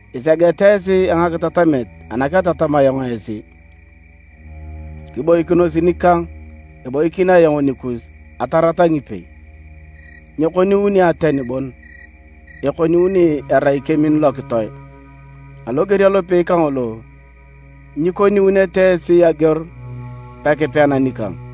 Isegeta esi a ngakitatamet ana ketatam ayong esi. Kiboikinos nikang, eboikin ayong nikus atarata ngipei. Nyekoniuni ateni bon, ekoniuni erai kemin lokitoe, aloger alopei kangolo, nyikoniunete esi ageor pekipean nikang.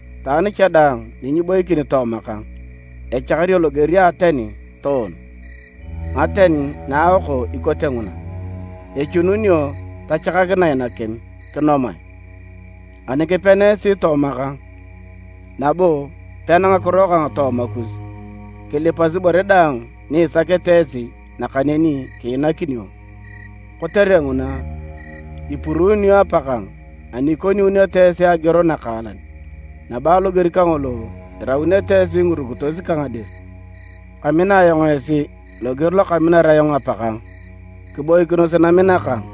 Itwaan cha daang ni nyiboikin tooma kang, echakario loger a ateni toon. Ngaten na aoko ikote nguna, echununio tachakakinae nakim, kinomae. Ani kipena esi tooma kang, nabo pena ngakiro kang tooma kus, kilipas ibore daang ni isakete nakaneni kiinakinio. Kotere nguna, ipuruunio Apakang ani ikoniuneto esi ageor nakaalan, nabo aloger kangolo, iraunete esi ngirukitos kang dir. Kamina ayong esi loger lo kaminar ayong Apakang, kiboikinos namina kang.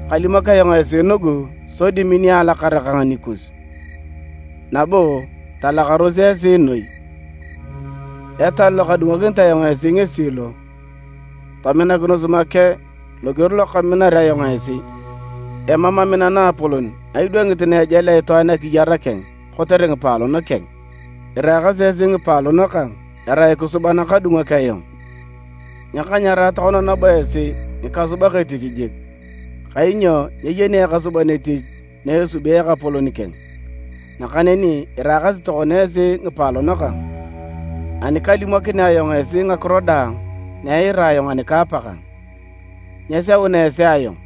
“Kalimok ayong esi nugu sodi minio alakara kang nikus, nabo talakaros esi noi. Etal lokadungokinit ayong esi ngesi lo, tominakinos make loger lokaminar ayong esi. Emam amina naapolon na idwangit na ejalea itwaan akiyar keng kotere ngipaalon keng. Iraakasi esi ngipaalon kang erai kisuba nakadungok ayong. Nyakanyarae tokona nabo esi ngikasubak etich jik, kainyo nyeyeni ekasuban etich na esubi ekapolon keng. Nakaneni iraakasi tokona esi ngipaalon kang, ani kalimokinea ayong esi ngakiro daang na eira ayong ani ka Apakang. Nyeseuna esi ayong,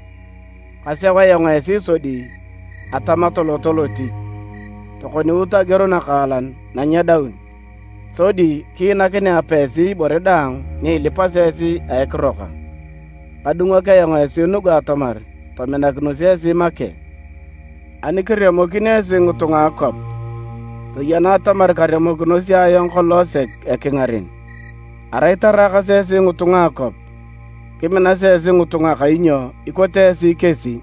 kaseu ayong esi sodi atama toloto lotich, tokoniut ageor nakaalan na nyedaun. Sodi kiinakinea Apa esi ibore daang ni ilipasi esi a ekiro kang. Kadungok ayong esi nugu atamar tominakinos esi make. “Ani kiremokin esi ngitunga a akwap, toyena atamar karemokinosi ayong kolong sek ekingaren. Arai taraakas esi ngitunga a akwap, kiminasi esi ngitunga kainyo ikote esi kesi.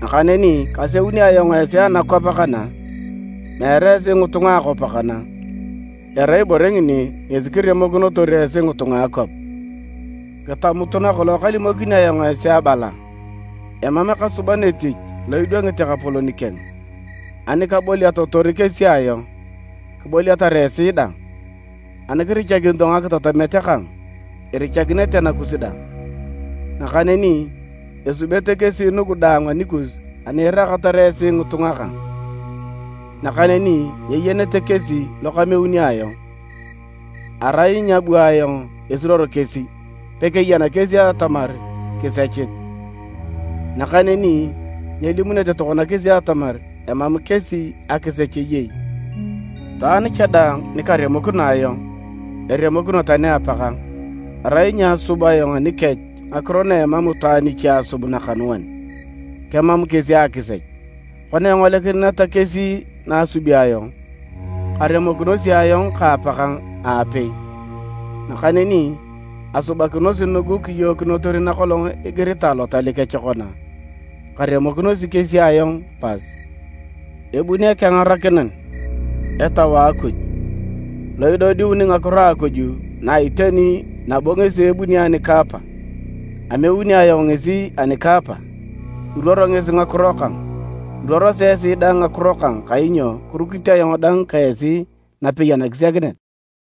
Nakaneni kaseuni ayong esi anakwap kana, meere esi ngitunga a akwap kana, erai ibore ngini ngesi kiremokinotor esi ngitunga a akwap. Kitamutu nakolong kalimokini ayong esi abala, ‘Emam ekasuban etich lo idwangit ekapolon keng.’ Ani kaboliatotor kesi ayong, kiboliatar esi dang, ani kirichakinito ngakitatamet kang, irichakinete nakus dang. Nakaneni esubete kesi nugu daang anikus ani iraakatar esi ngitunga kang, nakaneni nyeyenete kesi lo kameuni ayong. Arai nyaabu ayong esiruor kesi, pekeyan kesi atamar kisechit. Nakaneni nyelimunete tokona kesi atamar emam kesi akisech eyei. Itwaan cha daang nikaremokino ayong, eremokino tani Apakang. Arai nyaasub ayong anikech ngakiro na emam itwaan iche asub nakanuan, kemam kesi akisech. Kona engolikineta kesi na asubi ayong, karemokinosi ayong ka Apakang aapei. Nakaneni asubakinosi nugu kiyookinotor nakolong igiritae Lotal kech kona, ‘Karemokinosi kesi ayong pas.’ “Ebuni Ekengarakinan, Etau a Akuj, lo idodiuni ngakiro a Akuj na a iteni nabo ngesi ebunit ani ka Apa. Ameuni ayong ngesi ani ka Apa, iruoro ngesi ngakiro kang. Iruorosi esi dang ngakiro kang kainyo kirukit ayong dang ka esi napei anakisiakinet.